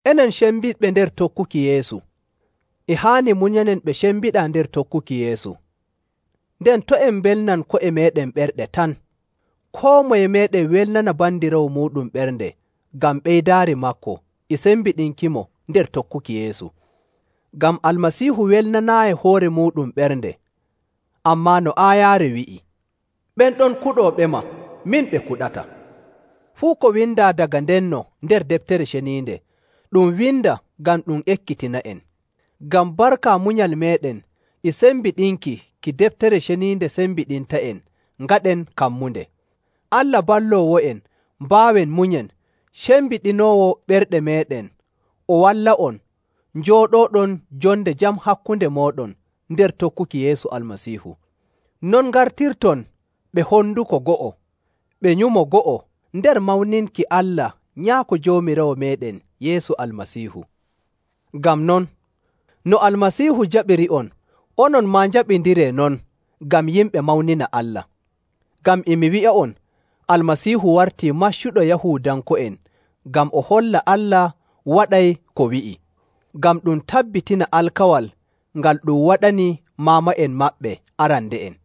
Enen cembiɗɓe nder tokkuki Yeesu, e haani munyanen ɓe cembiɗaa nder tokkuki Yeesu. Nden to' en mbelnan ko'e meeɗen ɓerɗe tan. Koo moye meeɗen welnana bandiraawo muuɗum ɓernde ngam ɓeydaari maako e sembiɗinkimo nder tokkuki Yeesu. Ngam Almasiihu welnanaayi hoore muuɗum ɓernde, ammaa no aayaare wi'i, “Ɓen ɗon kuɗooɓema, min ɓe kuɗata.”. Fuu ko windaa daga ndenno nder Deftere Ceniinde, ɗum winda ngam ɗum ekkitina'en, ngam barka munyal meeɗen e sembiɗinki ki Deftere Ceniinde sembiɗinta'en ngaɗen kammunde. Allah balloowo'en mbaawen munyen cembiɗinoowo ɓerɗe meeɗen o walla'on njooɗooɗon jonde jam hakkunde mooɗon nder tokkuki Yeesu Almasiihu. Non ngartirton ɓe honduko go'o ɓe nyumo go'o nder mawninki Allah Nyaako Joomiraawo meeɗen Yeesu Almasiihu. Ngam non, no Almasiihu jaɓiri'on, onon maa njaɓindiree non ngam yimɓe mawnina Allah. Ngam e mi wi'a'on Almasiihu wartii maccuɗo Yahuudanko'en ngam o holla Allah waɗay ko wi'i, ngam ɗum tabbitina alkawal ngal ɗum waɗani maama'en maɓɓe arande'en,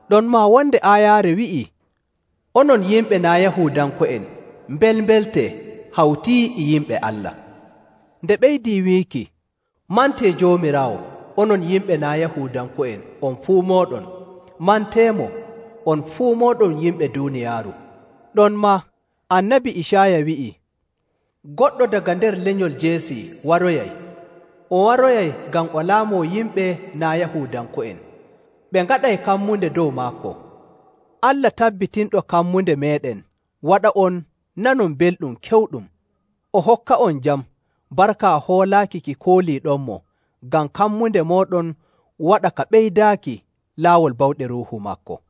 Ɗonmaa wonde aayaare wi'ii, “Onon yimɓe naa' Yahuudanko'en, mbelmbeltee hawti e yimɓe Allah.”. Nde ɓeydii wiiki, “Mantee Joomiraawo, onon yimɓe naa' Yahuudanko'en on fuu mooɗon, manteemo, on fuu mooɗon yimɓe duuniyaaru.”. Ɗonmaa, Annabi Icaaya wi'i, “Goɗɗo daga nder lenyol Jeesi waroyay, o waroyay ngam o laamoo yimɓe naa' Yahuudanko'en, ɓe ngaɗay kammunde dow maako.”. Allah tabbitinɗo kammunde meeɗen waɗa'on nanon belɗum kewɗum, o hokka'on jam barka hoolaaki ki kooliiɗonmo, ngam kammunde mooɗon waɗa ka ɓeydaaki laawol bawɗe Ruuhu maako.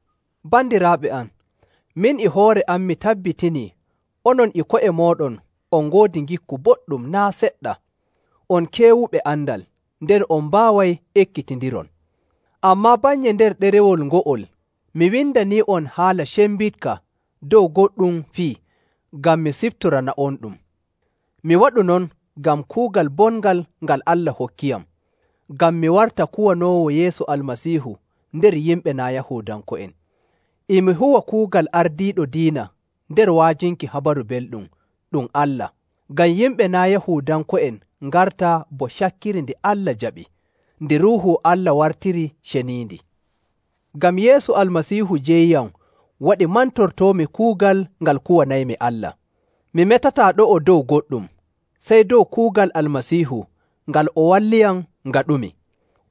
Bandiraaɓe am, min e hoore am mi tabbitinii onon e ko'e mooɗon on ngoodi ngikku boɗɗum naa' seɗɗa, on keewuɓe andal, nden on mbaaway ekkitindiron. Ammaa bannye nder ɗerewol ngo'ol mi windanii'on haala cembiɗka dow goɗɗum fii ngam mi siftorana'onɗum. Mi waɗu non ngam kuugal bongal ngal Allah hokkiyam, ngam mi warta kuwanoowo Yeesu Almasiihu nder yimɓe naa' Yahuudanko'en. E mi huwa kuugal ardiiɗo diina nder wa'ajinki Habaru Belɗum ɗum Allah, ngam yimɓe naa' Yahuudanko'en ngarta bo cakkiri ndi Allah jaɓi, ndi Ruuhu Allah wartiri ceniindi. Ngam Yeesu Almasiihu jeyiyam waɗi mantortoomi kuugal ngal kuwanaymi Allah. Mi metataa ɗo'o dow goɗɗum, sey dow kuugal Almasiihu ngal o walliyam ngaɗumi.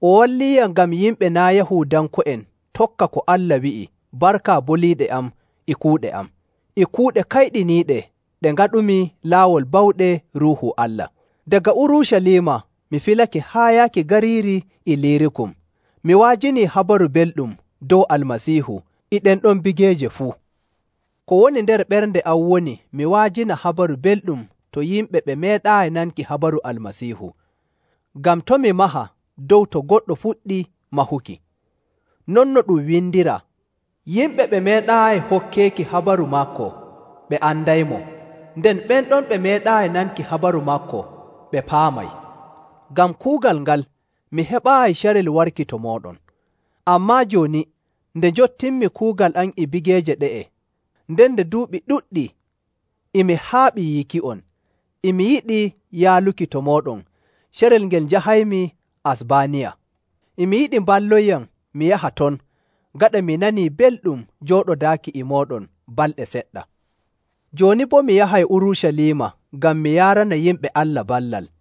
O walliiyam ngam yimɓe naa' Yahuudanko'en tokka ko Allah wi'i barka boliiɗe am e kuuɗe am, e kuuɗe kayɗiniiɗe ɗe ngaɗumi laawol bawɗe Ruuhu Allah. Daga Urucaliima mi filake haa yaaki gariiri Iliirikum, mi wa'ajini Habaru Belɗum dow Almasiihu e ɗen ɗon bigeeje fuu. Ko woni nder ɓernde am woni mi wa'ajina Habaru Belɗum to yimɓe ɓe meeɗaayi nanki habaru Almasiihu, ngam to' mi maha dow to goɗɗo fuɗɗi mahuki. Non no ɗum windiraa, “Yimɓe ɓe meeɗaayi hokkeeki habaru maako ɓe andaymo, nden ɓen ɗon ɓe meeɗaayi nanki habaru maako ɓe paamay.”. Ngam kuugal ngal, mi heɓaayi carel warki to mooɗon.. Ammaa jooni, nde njottinmi kuugal am e bigeeje ɗe'e, nden nde duuɓi ɗuɗɗi e mi haaɓi yiiki'on, e mi yiɗi yaaluki to mooɗon carel ngel njahaymi Asbaaniya. E mi yiɗi mballonyam mi yaha ton gaɗa mi nanii belɗum jooɗodaaki e mooɗon balɗe seɗɗa. Jooni boo mi yahay Urucaliima ngam mi yaarana yimɓe Allah ballal.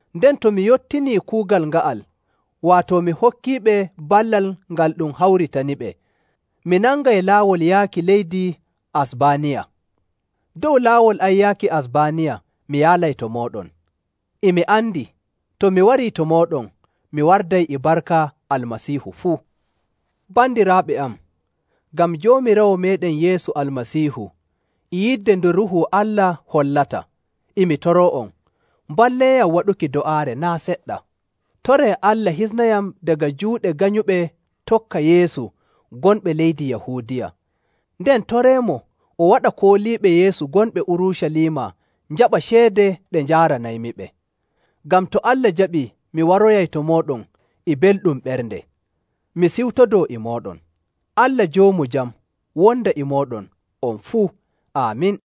Nden to mi yottinii kuugal nga'al, waato mi hokkiiɓe ballal ngal ɗum hawritaniɓe, mi nangay laawol yaaki leydi Asbaaniya. Dow laawol am yaaki Asbaaniya mi yaalay to mooɗon. E mi andi, to mi warii to mooɗon, mi warday e barka Almasiihu fuu. Bandiraaɓe am, ngam Joomiraawo meeɗen Yeesu Almasiihu e yidde nde Ruuhu Allah hollata, e mi toroo'on mballeeyam waɗuki do'aare naa' seɗɗa. Toree Allah hisnayam daga juuɗe ganyuɓe tokka Yeesu gonɓe leydi Yahuudiya, nden toreemo o waɗa kooliiɓe Yeesu gonɓe Urucaliima njaɓa ceede ɗe njaaranaymiɓe, ngam to Allah jaɓii mi waroyay to mooɗon e belɗum ɓernde, mi siwtodoo e mooɗon. Allah joomu jam wonda e mooɗon on fuu. Aamin.